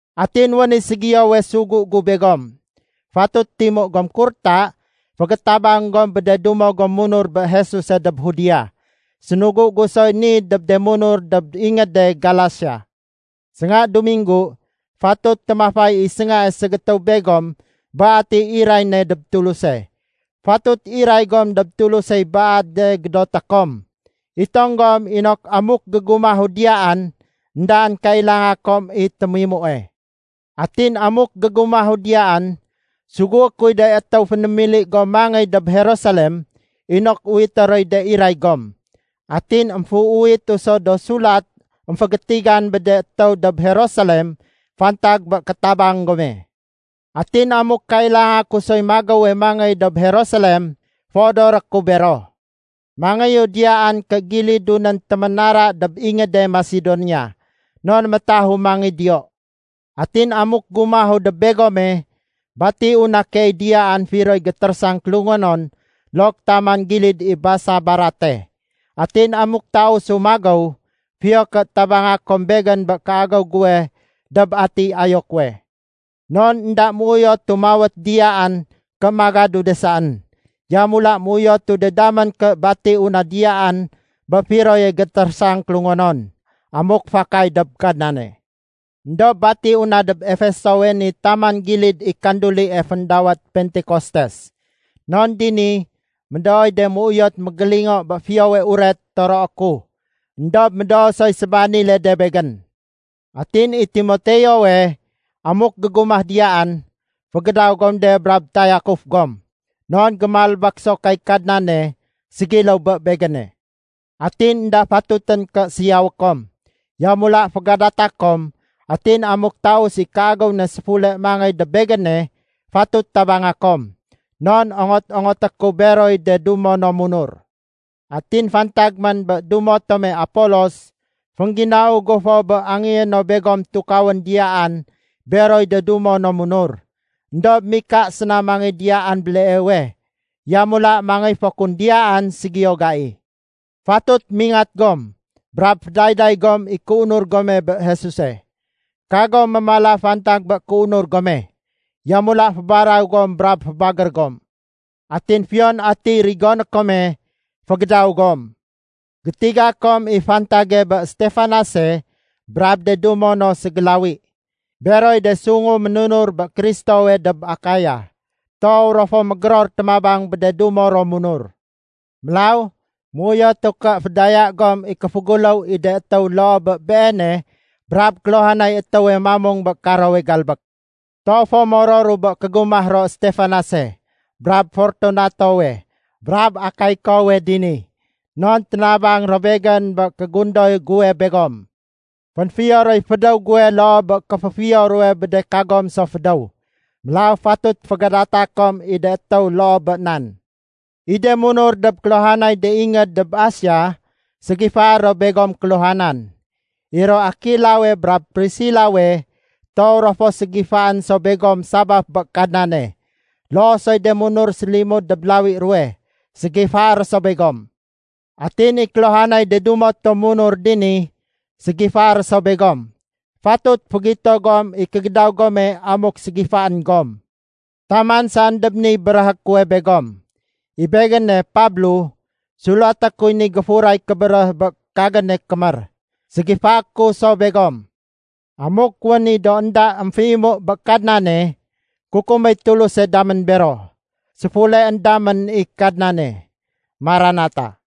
Atin wén i ségiyowe sugu gu begom. Fatut timu gom kurta fégétabang gom bé de dumo gom munur bé Jesuse dob Judea. Sénugu gu soy ni dob de munur dob ingéde Galasia. Sénga Duminggu, fatut témafay i séngae ségétéw begom bé atiy iray ne dob Tuluse. Fatut iray gom dob Tulusey baade gédoté kom. Itong gom inok amuk gégumahu diyaan, éndaén kailanga kom i témimue. Atin amuk gégumahu diyaan, sugué kuy de étéw fénémili gom mangéy dob Jerusalem inok uwité roy de iray gom. Atin émféuwitu so do sulat émfégétigan bé de étéw dob Jerusalem fantag bé kétabang gome. Atin amuk kailanga ku soy magéwe mangéy dob Jerusalem, féodoré ku bero. Mangéyu diyaan ké gilidu nén téménara dob ingéde Masedonia. Non métahu mangéy diyo. Atin amuk gumahu dob begome, batiu na keey diyaan firoy gétérésang kélungonon look taman gilid i basa barate. Atin amuk tausu magéw, fiyo ké tabanga kom begén bé kéagéw guwe dob atiy ayo kuwe. Non énda méuyotu mawét diyaan ké magadu de saén. Yamula méuyotu de damén ké batiu na diyaan bé firoye gétérésang kélungonon, amuk fakay dob Kadnane. Endob batiu na dob Efesowe ni taman gilid i kandulie féndawét Pentekostes. Non dini médooy de méuyot mégélingo bé Fiyowe Uret toroé ku. Endob médoo soy sébanile de begén. Atin i Timoteowe, amuk gégumah diyaan, fégédaw gom de brab tayakuf gom. Non gémalbék so kay Kadnane, ségiléw bé begéne. Atin énda fatutén ké siyawé kom. Yamula fégadata kom atin amuk taus i kéagéw ne séfule mangéy dob begéne, fatut tabanga kom. Non ongot-ongoté ku beroy de dumo no munur. Atin fantag man bé dumo tome Apolos, féngginau gu fo bé angéyé no begom tukawén diyaan beroy de dumo no munur. Endob mika séna mangéy diyaan béleewe. Yamula mangéy fo kun diyaan ségiyo gai. Fatut mingat gom, brab fédayday gom i kéunur gome bé Jesuse. Kagom mémala fantag bé kéunur gome. Yamula fébaraw gom brab fébagér gom. Atin fiyon atiy rigoné kome, fégédaw gom. Gétiga kom i fantage bé Stefanase brab de dumo no ségélawi. Beroy de sungu ménunur bé Kristowe dob Akaya. Toow ro fo mégéror témabang bé de dumo ro munur. Mélaw, méuyotu ké fédaya gom i kéféguléw i de étéw loo bé beene brab kéluhanay étéwe mamung bé karowe galbék. Toow fo mororu bé kégumah ro Stefanase, brab Fortunatowe brab Akaikowe dini. Non ténabang ro begén bé kégundoy guwe begom. Fénfiyo roy fédéw guwe loo bé kéféfiyo ruwe bé de kagom so fédéw. Mélaw fatut fégadata kom i de étéw loo bé nan. I de munur dob kéluhanay de ingéd dob Asia ségifaé ro begom kéluhanan. I ro Akilawe brab Prisilawe, toow ro fo ségifaén so begom sabaf bé Kadnane. Loo soy de munur sélimud dob lawi ruwe, ségifaé ro so begom. Atin i kéluhanay de dumo tom munur dini, ségifaé ro so begom. Fatut fégito gom i kégédaw gome amuk ségifaén gom. Taman saén dob niy béréhé kuwe begom. I begéne, Pablo, sulaté kuy ni géfuray kébéréh bé kagéne kémér. Ségifaé ku so begom. Amuk wén i do énda émféimu bé Kadnane, kukuméy Tuluse damén bero. Séfuleén damén i Kadnane. (Maranata.)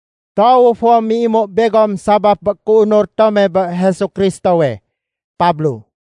Toowu fo méimu begom sabaf bé kéunur tome bé Jesu Kristowe. Pablo